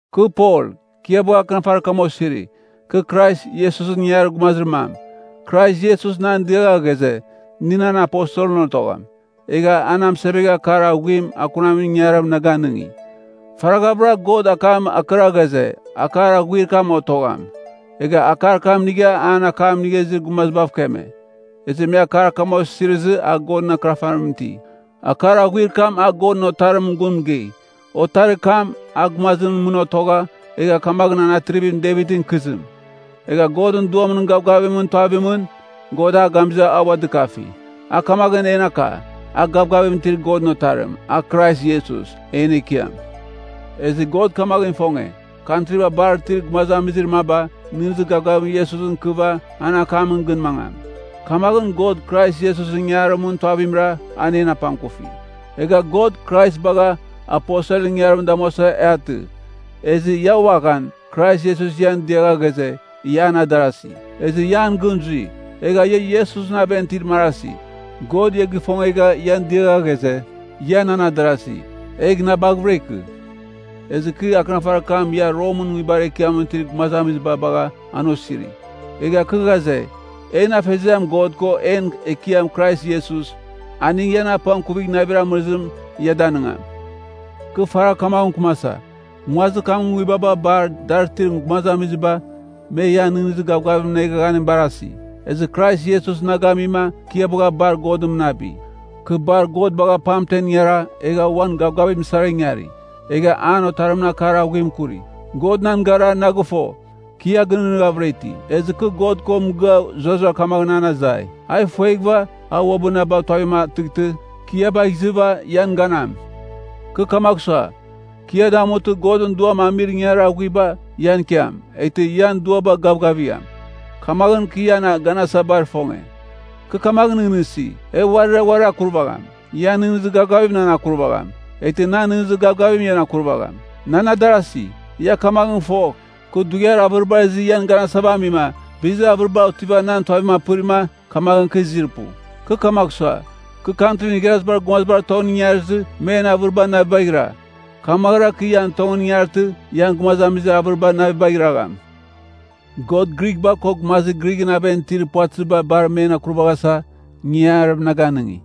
Kɨ Pol, kɨ ia bagha akɨnafarir kam osiri. Kɨ Krais Iesusɨn ingangarir gumazir mam. Krais Iesus nan diagha ghaze, nɨ nan aposelɨn otogham. Egha a na mɨsevegha akar aghuim akunamin ingangarim na ganɨngi. Faraghavɨra God akam akɨra ghaze, akar aghuir kam otogham. Egha akar kam inigha, an akam inigha izir gumazibav keme. Ezɨ me akar kam osirizɨ a Godɨn Akɨnafarimɨn iti. Akar aghuir kam a Godɨn Otarimɨn gun mɨgei. Otarir kam, a gumazimɨn mɨn otogha, egha kamaghɨn a Atrivim Devitɨn ikɨzim. Egha Godɨn Duamɨn gavgavimɨn tuavimɨn, God a gamizɨ a ua dɨkafi, a kamaghɨn en aka, a gavgavim itir Godɨn Otarim: A Krais Iesus, en Ekiam. Ezɨ God kamaghɨn ifonge, kantriba bar itir gumazamizir maba, nɨghnɨzir gavgavim Iesusɨn ikɨva an akamɨn gɨn mangam. Kamaghɨn God, Krais Iesusɨn ingangarimɨn tuavimra, a en apangkufi. Egha God, Krais bagha, aposelɨn inangarim damuasa e atɨ. Ezɨ ia uaghan, Krais Iesus ian diagha ghaze, ia nan adarasi, ezɨ ia an gɨn zui. Egha ia Iesusɨn aven itir marasi. God ia gifongegha ian diagha ghaze, ia nan adarasi, egh na baghɨvɨra ikɨ. Ezɨ kɨ akɨnafarir kam ia Romɨn nguibar ekiamɨn itir gumazamiziba bagha an osiri. Egha kɨ ghaze, en Afeziam God ko en Ekiam Krais Iesus, aning ian apangkuvighɨva navir amɨrizim ia danɨngam. Kɨ faragh kamaghɨn mɨkɨmasa. Nguazir kamɨn nguibaba bar dar itir gumazamiziba, me ian nɨghnɨzir gavgavimɨn eghaghanim barasi. Ezɨ Krais Iesus na gamima, kɨ ia bagha bar God mɨnabi. Kɨ bar God bagha pamten ingara, egha uan gavgavim sara ingari, egha an Otarimɨn akar aghuim akuri. God nan gara na gɨfo, kɨ ia gɨnɨghnɨghavɨra iti. Ezɨ kɨ God ko mɨgɨa zurara kamaghɨn an azai, a ifueghɨva, a uabɨ na bagh tuavitam atɨghtɨ, kɨ ia bagh izɨva ian ganam. Kɨ kamagh sua, kɨ ia damutɨ, Godɨn Duam amir ingangarir aghuiba, ian ikiam, eghtɨ ian duaba gavgavigham. Kamaghɨn, kɨ ian ganasa bar ifonge. Kɨ kamaghɨn nɨghnɨsi. E uarira uarir akurvagham. Ian nɨghnɨzir gavgavim nan akuragham. Eghtɨ nan nɨghnɨzir gavgavim ian akurvagham. Nan adarasi, ia kamaghɨn fogh, kɨ dughiar avɨribar izɨ ian ganasava amima, bizir avɨriba otiva nan tuavim apɨrima, kamaghɨn kɨ izir pu. Kɨ kamagh sua, kɨ Kantrin Igharazibar Gumazibar tongɨn ingarizɨ, men avɨriba navibagh ira, kamaghɨra, kɨ ian tongɨn ingartɨ, ian gumazamizir avɨriba navibagh iragham. God Grighba ko gumazir Grighɨn aven itir puvatɨziba bar men akurvaghasa ingangarim na ganɨngi,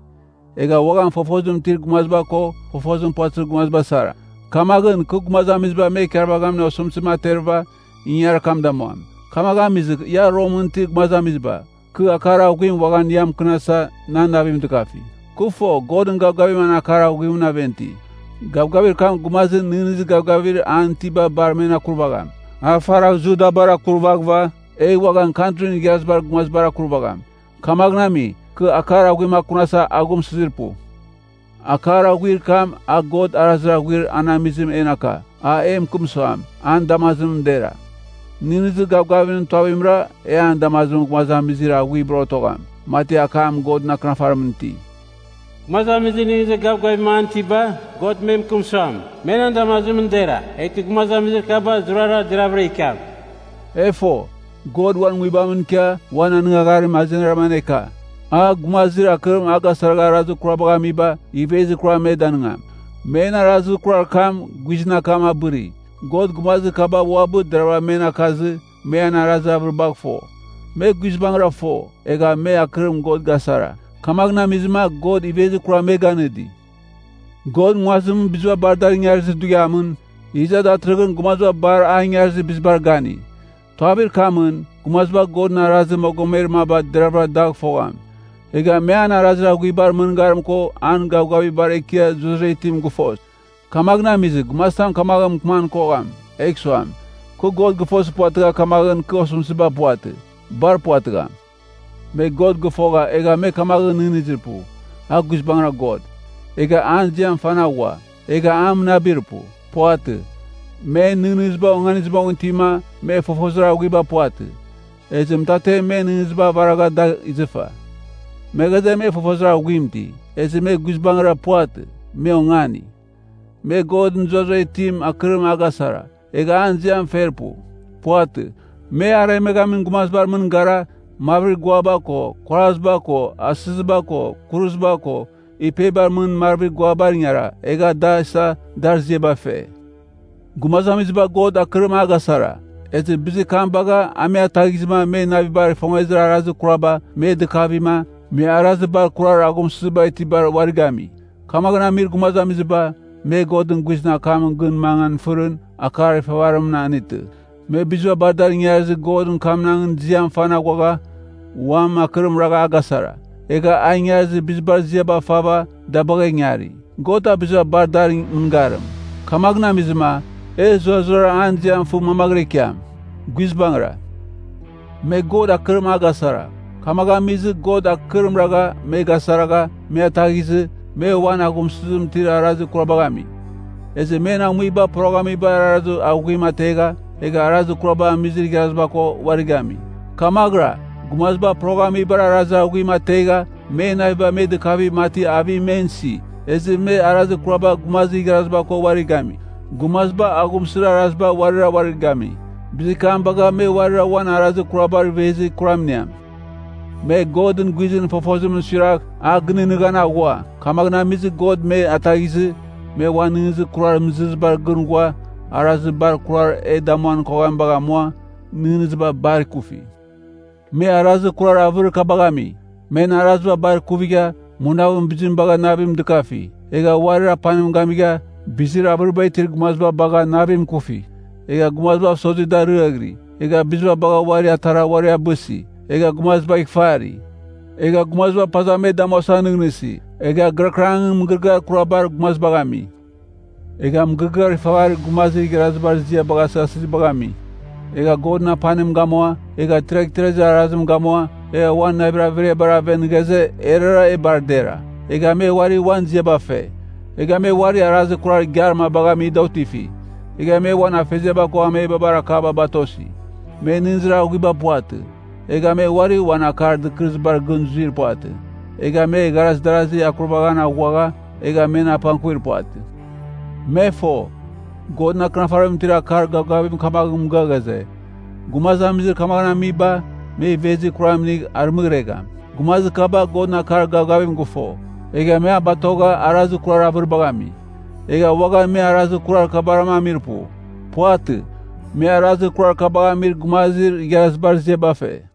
egha uaghan fofozim itir gumaziba ko fofozim puvatɨzir gumaziba sara. Kamaghɨn, kɨ gumazamiziba me ikarvaghamin osɨmtɨzim aterɨva, ingangarir kam damuam. Kamaghɨn amizɨ ia Romɨn itir gumazamiziba, kɨ akar aghuim uaghan ian mɨkɨnasa, nan navim dɨkafi. Kɨ fo, Godɨn gavgavim an akar aghuimɨn aven iti. Gavgavir kam gumazir nɨghnɨzir gavgavir an itiba bar men akurvagham. A faragh Judabar akurvaghɨva, egh uaghan Kantrin Igharazibar Gumazibar akurvagham. Kamaghɨn ami, kɨ akar aghuim akunasa aghumsɨzir pu. Akar aghuir kam, a God arazir aghuir an amizim en aka, an e mɨkɨm suam, an damazimɨn dera. Nɨghnɨzir gavgavimɨn tuavimra e an damazimɨn gumazamizir aghuibar otogham. Mati akam Godɨn Akɨnafarimɨn iti, “Gumazamizir nɨghnɨzir gavgavim an itiba, God me mɨkɨm suam, me nan damazimɨn dera, eghtɨ gumazamizir kaba zurara deraghvɨra ikiam.” E fo, God uan Nguibamɨn ikia uan anɨngagharim azenimra aneka. A, gumazir akɨrim agasaragha arazir kurabagh amiba, ivezir kuram me danɨngam. Men arazir kurar kam guizɨn akam abɨri. God gumazir kaba uabɨ deravɨra men akazɨ, me an arazir avɨribagh fo. Me guizbangɨra fo, egha me akɨrim God gasara, kamaghɨn amizɨma God ivezir kuram me ganɨdi. God nguazimɨn biziba bar dar ingarizir dughiamɨn, iza datɨrɨghɨn gumaziba bar a ingarizir bizibar gani. Tuavir kamɨn, gumaziba Godɨn arazir mogomer maba deravɨra dagh fogham. Egha me an arazir aghuibar mɨngarim ko an gavgavir bar ekiar zurara itim gɨfos. Kamaghɨn amizɨ, gumazitam kamaghɨn mɨkɨman kogham egh suam, “Kɨ God gɨfozir puvatɨgha kamaghɨn kɨ osɨmtɨziba puvatɨ.” Bar puvatɨgham! Me God gɨfogha egha me kamaghɨn nɨghnɨzir pu, “A guizbangɨra God.” Egha an ziam fan aghua. Egha a mɨnabir pu. Puvatɨ. Men nɨghnɨziba onganizɨ moghɨn itima, me fofozir aghuiba puvatɨ, ezɨ mɨtatem men nɨghnɨziba avaragha dagh izɨfa. Me ghaze, me fofozir aghuim iti. Ezɨ me guizbangɨra puvatɨ, me ongani. Me Godɨn zurara itim akɨrim a gasara, egha an ziam fer pu. Puvatɨ. Me aremeghamin gumazibar mɨn gara, marvir guaba ko, kuaraziba ko, asɨziba ko, kuruziba ko, ipebar mɨn marvir guabar ingara, egha da isa dar ziaba fe. Gumazamiziba God akɨrim a gasara, ezɨ bizir kam bagha a me ataghizɨma men navibar ifongezir arazir kuraba me dɨkavima, me arazir bar kurar aghumsɨziba itibar uari gami. Kamaghɨn amir gumazamiziba, me Godɨn guizɨn akamɨn gɨn mangan fɨrɨn, akar ifavarimɨn anetɨ. Me biziba bar adar ingarizir Godɨn kamnangɨn ziam fan aghuagha, uam akɨrim ragha a gasara. Egha a ingarizir bizibar ziaba fava da bagha ingari. God a biziba bar dar mɨngarim, kamaghɨn amizɨma, e zurazurara an ziam fɨ mamaghɨra ikiam! Guizbangɨra! Me God akɨrim a gasara, kamaghɨn amizɨ God akɨrim ragha me gasaragha me ataghizɨ, me uan aghumsɨzim itir arazir kurabagh ami. Ezɨ men amuiba poroghamibar arazir aghuim ategha egha arazir kuraba amizir igharaziba ko uari gami. Kamaghɨra, gumaziba poroghamibar arazir aghuim ategha men naviba me dɨkava mati avim men isi, ezɨ me arazir kuraba gumazir igharaziba ko uari gami. Gumaziba aghumsɨzir araziba uarira uari gami, bizir kam bagha me uarira uan arazir kurabar ivezir kuram iniam. Me Godɨn guizɨn fofozim suiragh a gɨnɨghnɨghan aghua, kamaghɨn amizɨ God me ataghizɨ, me uan nɨghnɨzir kurar mɨzɨrɨzibar gɨn ghua arazir bar kurar e damuan koghamibagh amua, nɨghnɨziba bar ikufi. Me arazir kurar avɨrir kabagh ami: men araziba bar ikuvigha, munavɨn bizim bagha navim dɨkafi, egha uarir apanim gamigha, bizir avɨriba itir gumaziba bagha navim ikufi, egha gumazibav sozima da ariaghɨri, egha biziba bagha uarir atara uari abɨsi, egha gumazibagh ifari. Egha gumaziba paza me damuasa nɨghnɨsi, egha gɨrakɨrangɨn mɨgɨrɨgɨar kurabar gumazibagh ami. Egha mɨgɨrɨgɨar ifavarir gumazir igharazibar ziabagh asɨghasɨzibagh ami. Egha Godɨn apanim gamua, egha tiraghtirazir arazim gamua, egha uan navir averiabar aven ghaze erara e bar dera, egha me uari uan ziaba fe. Egha me uari arazir kurar igiar mabagh ami da otifi. Egha me uan afeziaba ko amebabar akaba batosi. Me nɨghnɨzir aghuiba puvatɨ. Egha me uari uan akar dɨkɨrɨzibar gɨn zuir puvatɨ. Egha me igharaz darazir akurvaghan aghua, egha men apangkuvir puvatɨ. Me fo, Godɨn Akɨnafarimɨn itir akar gavgavim kamaghɨn mɨgɨa ghaze, “Gumazamizir kamaghɨn amiba, me ivezir kuram inigh arɨmɨghregham.” Gumazir kaba Godɨn akar gavgavim gɨfo, egha me a batogha arazir kurar avɨribagh ami. Egha uaghan me arazir kurar kabarama amir pu. Puvatɨ. Me arazir kurar kabagh amir gumazir igharazibar ziaba fe.